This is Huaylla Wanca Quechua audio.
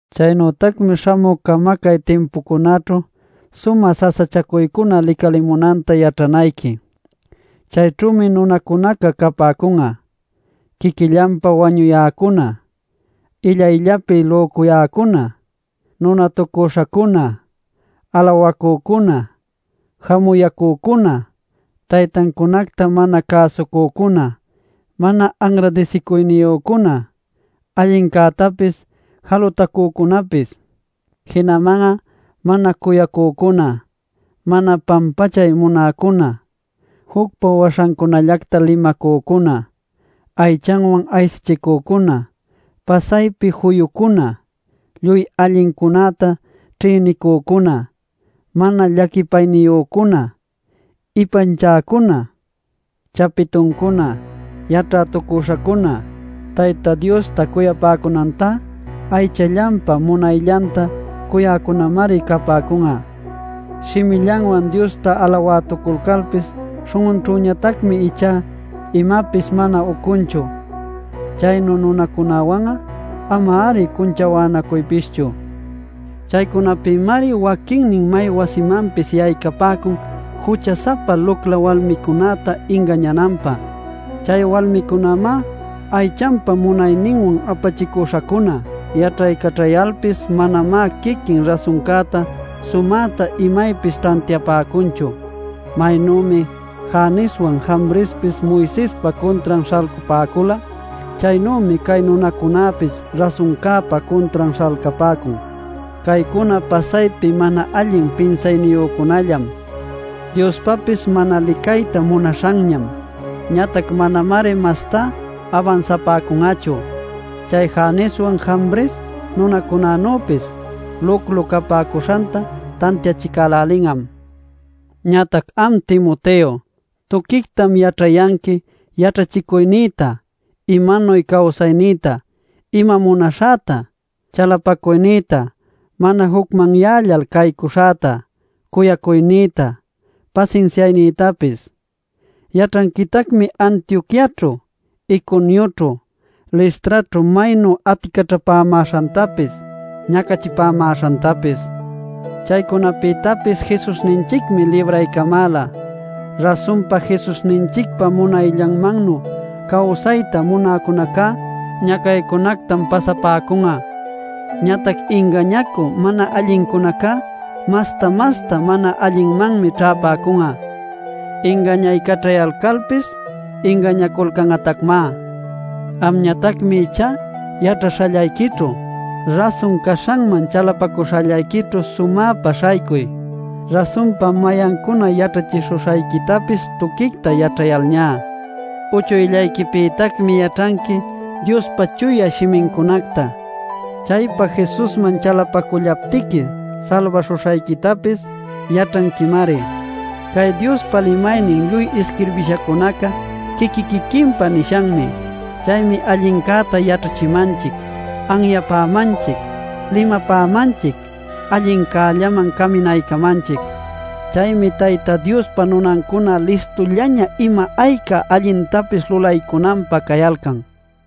Chaynütacmi śhamü camacay timpucunäćhu sumä sasachacuycuna licalimunanta yaćhanayqui. Chayćhümi nunacunaca capäcun'a: quiquillanpa wañuyäcuna, illayllapi lücuyäcuna, nunatucüśhacuna, alawacücuna, jamuyäcücuna, taytancunacta mana cäsucücuna, mana anradisicuyniyücuna, allincätapis jalutacücunapis. Jinaman'a mana cuyacücuna, mana pampachay munäcuna, jucpa waśhancunallacta limacücuna, aychanwan aysachicücuna, pasaypi juyucuna, lluy allincunäta ćhïnicücuna, mana llaquipayniyücuna, ipanchäcuna, chapituncuna, yaćhätucüśhacuna, Tayta Diosta cuyapäcunantá aychallanpa munayllanta cuyäcunämari capäcun'a. Shimillanwan Diosta alawätuculcalpis śhun'unćhüñatacmi ichá imapis mana ucunchu. Chaynu nunacunawan'a ama-ari cunchawänacuypischu. Chaycunapïmari waquinnin may wasimanpis yaycapäcun jucha-sapa lucla walmicunäta ingañananpä; chay walmicunamá aychanpa munayninwan apachicuśhacuna. Yaćhaycaćhayalpis manamá quiquin rasuncäta sumäta imaypis tantiapäcunchu. Maynümi Janeswan, Jambrespis Moisespa cuntran śhalcapäcula, chaynümi cay nunacunäpis rasuncäpa cuntran śhalcapäcun. Caycuna pasaypi mana allin pinsayniyücunallam, Diospapis mana licayta munaśhanñam. Ñatac manamari mastá abansapäcun'achu; chay Janeswan Jambres nunacunanüpis luclu capäcuśhanta tantiachicälälin'am. Ñatac am Timoteo, tuquictam yaćhayanqui yaćhachicuynïta, imanuy cawsaynïta, ima munaśhäta, chalapacuynïta, mana jucmanyällal caycuśhäta, cuyacuynïta, pasinsiaynïtapis. Yaćhanquitacmi Antioquiaćhu, Iconioćhu, Listraćhu maynu aticaćhapämäśhantapis ñacachipämäśhantapis. Chaycunapïtapis Jesusninchicmi libraycamäla. Rasunpa, Jesusninchicpa munayllanmannu cawsayta munäcunacá ñacaycunactam pasapäcun'a. Ñatac ingañacü mana allincunacá masta-masta mana allinmanmi ćhäpäcun'a; ingañaycaćhayalpis ingañanaculcan'atacmá. Amñatacmi ichá yaćhaśhallayquićhu, rasun caśhanman chalapacuśhallayquićhu sumäpa śhaycuy, rasunpa mayancuna yaćhachishuśhayquitapis tuquicta yaćhayalñá. Uchuyllayquipïtacmi yaćhanqui Diospa Chuya Shimincunacta; chaypa Jesusman chalapacullaptiqui salbaśhuśhayquitapis yaćhanquimari. Cay Diospa limaynin lluy isquirbishacunaca quiqui-quiquinpa nishanmi. Chaymi allincäta yaćhachimanchic, anyapämanchic, limapämanchic, allincällaman caminaycamanchic. Chaymi Tayta Diospa nunancuna listullaña ima ayca allintapis lulaycunanpä cayalcan.